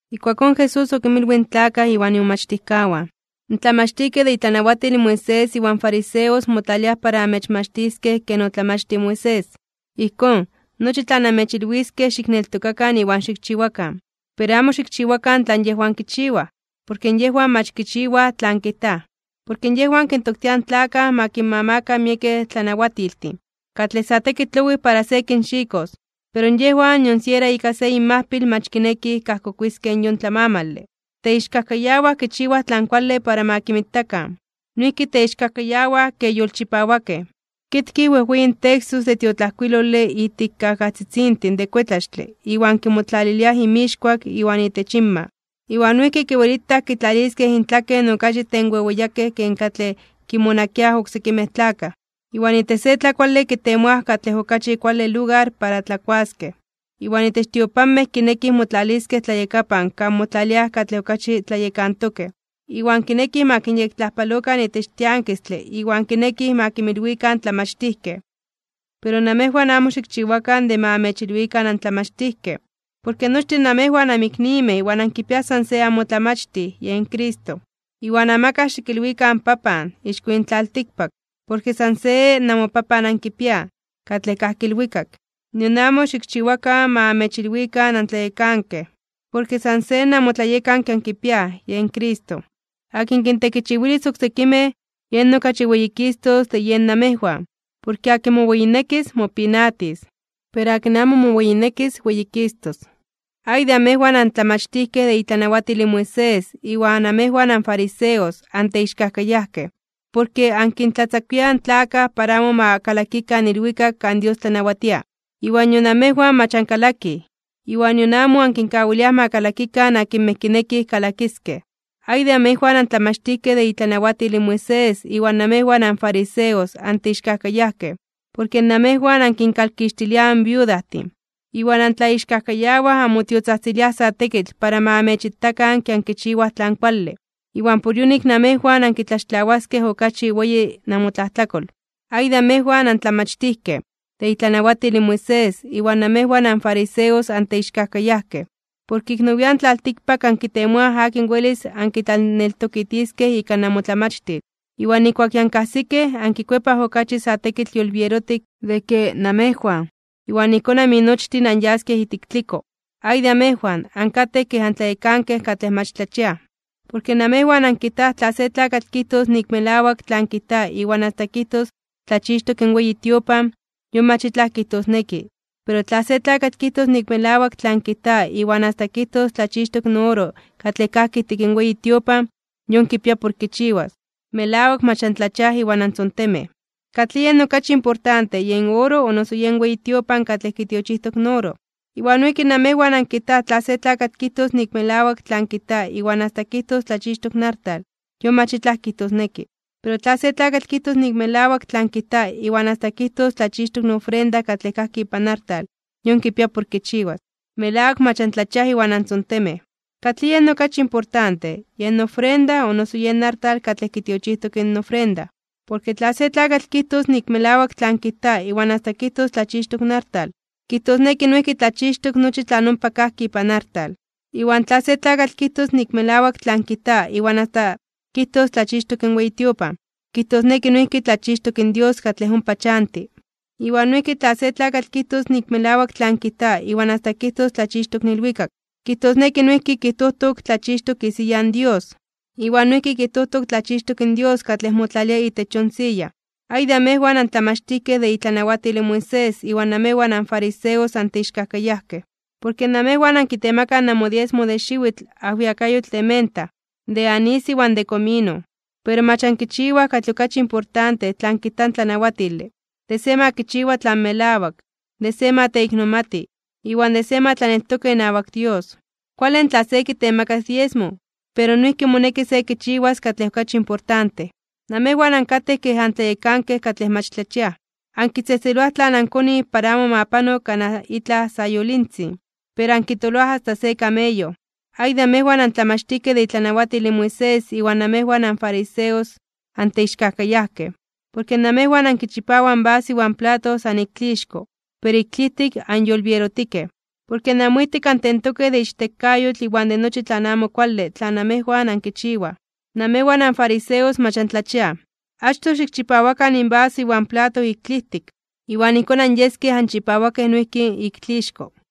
Ijkuakón Jesús okinmilwij in tlakaj iwan imomachtijkawan: ―In tlamachtijkej de itlanawatil in Moisés iwan fariseos motlaliaj para amechmachtiskej ken otlamachtij in Moisés. Ijkón, nochi tlan amechilwiskej xikneltokakan iwan xikchiwakan. Pero amo xikchiwakan tlan yejwan kichiwaj, porke yejwan mach kichiwaj tlan kijtaj. Porke yejwan kintoktiaj in tlakaj ma kinmamakan miekej tlanawatiltin, katlej sa tekitl owijtitok para se kinxikos. Pero yejwan nion siera ika se inmajpil mach kinekij kajkokuiskej yon tlamamale. Teixkajkayawaj kichiwaj tlan kuale para ma kinmitakan. Noijki teixkajkayawaj ke yolchipawakej, kitkij wejweyin textos de tiotlajkuilole ijtik kajajtzitzintin de kuetlaxtle iwan kimotlaliliaj inmixkuak iwan itech inma. Iwan noijki kiwelitaj kitlaliskej intlaken okachi tenweweyakej ken katlej kinmonakiaj oksekimej tlakaj. Iwan itech se tlakuale kitemoaj katlej okachi kuale lugar para tlakuaskej, iwan itech tiopanmej kinekij motlaliskej tlayakapan kan motlaliaj katlej okachi tlayekantokej, iwan kinekij ma kinyektlajpalokan itech tiankistle iwan kinekij ma kinmilwikan tlamachtijkej. ’Pero namejwan amo xikchiwakan de ma amechilwikan antlamachtijkej, porke nochtin namejwan anmiknimej iwan ankipiaj san se amoTlamachtij, yen Cristo. Iwan amakaj xikilwikan “papan” ixko yin tlaltikpak, porke san se namoPapan ankipiaj, katlej kajki ilwikak. Nion amo xikchiwakan ma amechilwikan antlayekankej, porke san se namoTlayekanke ankipiaj, yen Cristo. Akin kintekichiwilis oksekimej, yen okachi weyikistos de yen namejwan. Porke akin moweyinekis, mopinatis. Pero akin amo moweyinekis, weyikistos. ’¡Ay de amejwan, antlamachtijkej de itlanawatil in Moisés iwan amejwan anfariseos, anteixkajkayajkej! Porke ankintlatzakuiaj in tlakaj para amo ma kalakikan ilwikak kan Dios tlanawatia. Iwan nion amejwan mach ankalakij, iwan nion amo ankinkawiliaj ma kalakikan akinmej kinekij kalakiskej. ’¡Ay de amejwan, antlamachtijkej de itlanawatil in Moisés iwan namejwan anfariseos, anteixkajkayajkej! Porke namejwan ankinkalkixtiliaj in viudajtin, iwan antlaixkajkayawaj anmotiotzajtziliaj sa tekitl para ma amechitakan ke ankichiwaj tlan kuale. Iwan por yonik namejwan ankitlaxtlawaskej okachi weyi namotlajtlakol. ’¡Ay de amejwan, antlamachtijkej de itlanawatil in Moisés iwan namejwan anfariseos, anteixkajkayajkej! Porke ik nowian (nian nepa) tlaltikpak ankitemoaj akin welis ankitlaneltokitiskej ika namotlamachtil. Iwan nijkuak ya ankajsikej, ankikuepaj okachi sa tekitl yolbierotik de ke namejwan. Iwan ijkón aminochtin anyaskej ijtik tliko. ’¡Ay de amejwan, ankatej kej antlayekankej katlej mach antlachiaj! Porke namejwan ankijtaj tla se tlakatl kijtos nik melawak tlan kijta iwan asta kijtos tlachixtok in weyi tiopan, yon mach itlaj kijtosneki, pero tla se tlakatl kijtos nik melawak tlan kijta iwan asta kijtos tlachixtok in oro katlej kajki ijtik in weyi tiopan, yon kipia por kichiwas. ¡Melawak mach antlachiaj iwan antzontemej! ¿Katlij yen okachi importante: yen oro, o noso yen weyi tiopan katlej kitiochijtok in oro? Iwan noijki namejwan ankijtaj tla se tlakatl kijtos nik melawak tlan kijta iwan asta kijtos tlachixtok in artal, yon mach itlaj kijtosneki. Pero tla se tlakatl kijtos nik melawak tlan kijta iwan asta kijtos tlachixtok in ofrenda katlej kajki ipan artal, yon kipia por kichiwas. ¡Melawak mach antlachiaj iwan antzontemej! ¿Katlij yen okachi importante: yen ofrenda, o noso yen artal katlej kitiochijtok in ofrenda? Porke tla se tlakatl kijtos nik melawak tlan kijta iwan asta kijtos tlachixtok in artal, kijtosneki noijki tlachixtok nochi tlan ompa kajki ipan artal. Iwan tla se tlakatl kijtos nik melawak tlan kijta iwan asta kijtos tlachixtok in weyi tiopan, kijtosneki noijki tlachixtok in Dios katlej ompa chanti. Iwan noijki tla se tlakatl kijtos nik melawak tlan kijta iwan asta kijtos tlachixtok in ilwikak, kijtosneki noijki kijtojtok tlachixtok isiya in Dios, iwan noijki kijtojtok tlachixtok in Dios katlej motlalia itech yon siya. ’¡Ay de amejwan, antlamachtijkej de itlanawatil in Moisés iwan namejwan anfariseos, anteixkajkayajkej! Porke namejwan ankitemakaj namodiesmo de xiwitl ajwiakayotl de menta, de anís iwan de komino. Pero mach ankichiwaj katlej okachi importante tlan kijta in tlanawatile, de se ma kichiwa tlan melawak, de se ma teiknomati, iwan de se ma tlaneltoka inawak Dios. Kuale in tla se kitemakas diesmo, pero noijki moneki se kichiwas katlej okachi importante. Namejwan ankatej kej antlayekankej katlej mach tlachiaj, ankitzejtzeloaj tlan ankonij para amo ma pano kanaj itlaj sayolintzin, ¡pero ankitoloaj asta se kameyo! ’¡Ay de amejwan, antlamachtijkej de itlanawatil in Moisés iwan namejwan anfariseos, anteixkajkayajkej! Porke namejwan ankichipawaj in vaso iwan plato san ik tlixko, pero ik tlijtik anyolbierotikej. Porke namoijtik antentokej de ichtekayotl iwan de nochi tlan amo kuale tlan namejwan ankichiwaj. Namejwan anfariseos mach antlachiaj. Achtoj xikchipawakan in vaso iwan plato ik tlijtik, iwan ijkón anyeskej anchipawakej noijki ik tlixko.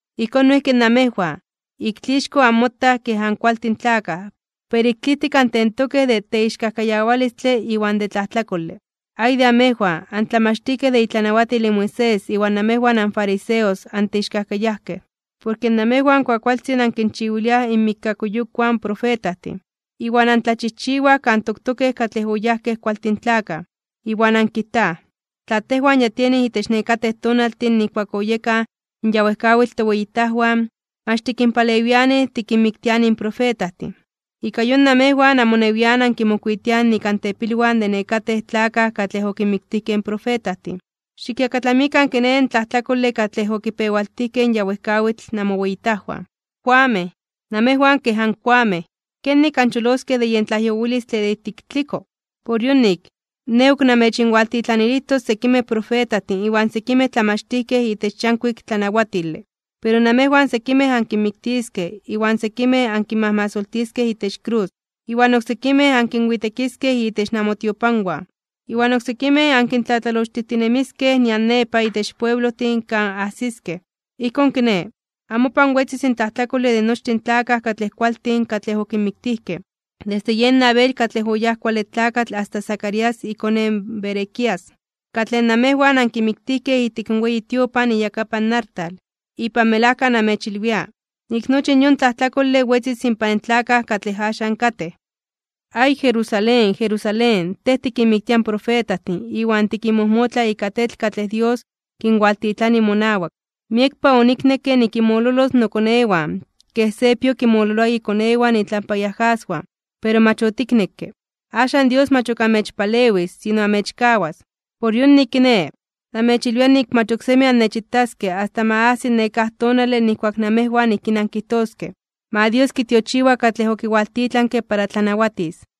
Ijkón noijki namejwan, ik tlixko anmotaj kej ankualtin tlakaj, pero ik tlijtik antentokej de teixkajkayawalistle iwan de tlajtlakole. ’¡Ay de amejwan, antlamachtijkej de itlanawatil in Moisés iwan namejwan anfariseos, anteixkajkayajkej! Porke namejwan kuakualtzin ankinchiwiliaj inmikkakuyokwan in profetajtin, iwan antlachijchiwaj kan toktokej katlej oyajkej kualtin tlakaj. Iwan ankijtaj: “Tla tejwan ya tienij itech nekatej tonaltin nijkuak oyekaj in ya wejkawitl toweyitajwan, mach tikinpalewianij tikinmiktianij in profetajtin.” Ika yon, namejwan amonewian ankimokuitiaj nik antepilwan de nekatej tlakaj katlej okinmiktijkej in profetajtin. Xikyakatlamikan kiné, in tlajtlakole katlej okipewaltijkej in ya wejkawitl namoweyitajwan. ’¡Koamej! ¡Namejwan kej ankoamej! ¿Kenik ancholoskej de yen tlajyowilistle de ijtik tliko? Por yonik, Nej ok namechinwalintitlanilijtos sekimej profetajtin iwan sekimej tlamachtijkej itech yankuik tlanawatile. Pero namejwan sekimej ankinmiktiskej iwan sekimej ankinmajmasoltiskej itech krus, iwan oksekimej ankinwitekiskej itech namotiopanwan, iwan oksekimej ankintlatlalochtijtinemiskej nian nepa itech pueblojtin kan ajsiskej. Ijkón kiné, amopan wetzis in tlajtlakole de nochtin in tlakaj katlej kualtin katlej okinmiktijkej, desde yen Abel katlej oyáj kuale tlakatl asta Zacarías ikone in Berequías, katlej namejwan ankimiktijkej ijtik in weyi tiopan iyakapan artal. Ipan melajka namechilwia, nik nochi in yon tlajtlakole wetzis inpan tlakaj katlej axan katej. ’¡Ay, Jerusalén, Jerusalén, tej tikinmiktia in profetajtin iwan tikinmojmotla ika tetl katlej Dios kualintitlani monawak! ¡Miekpa oniknekke nikinmololos mokonewan, ken se pio kinmololoa ikonewan itlampa iajaswan, pero mach otiknekke! Axan Dios mach ok amechpalewis, sino amechkawas. Por yonik kiné, namechilwia nik mach oksemi annechitaskej asta ma ajsiki nekáj tonale nijkuak namejwan ijkín ankijtoskej: “¡Ma Dios kitiochiwa katlej okiwaltitlanke para tlanawatis!”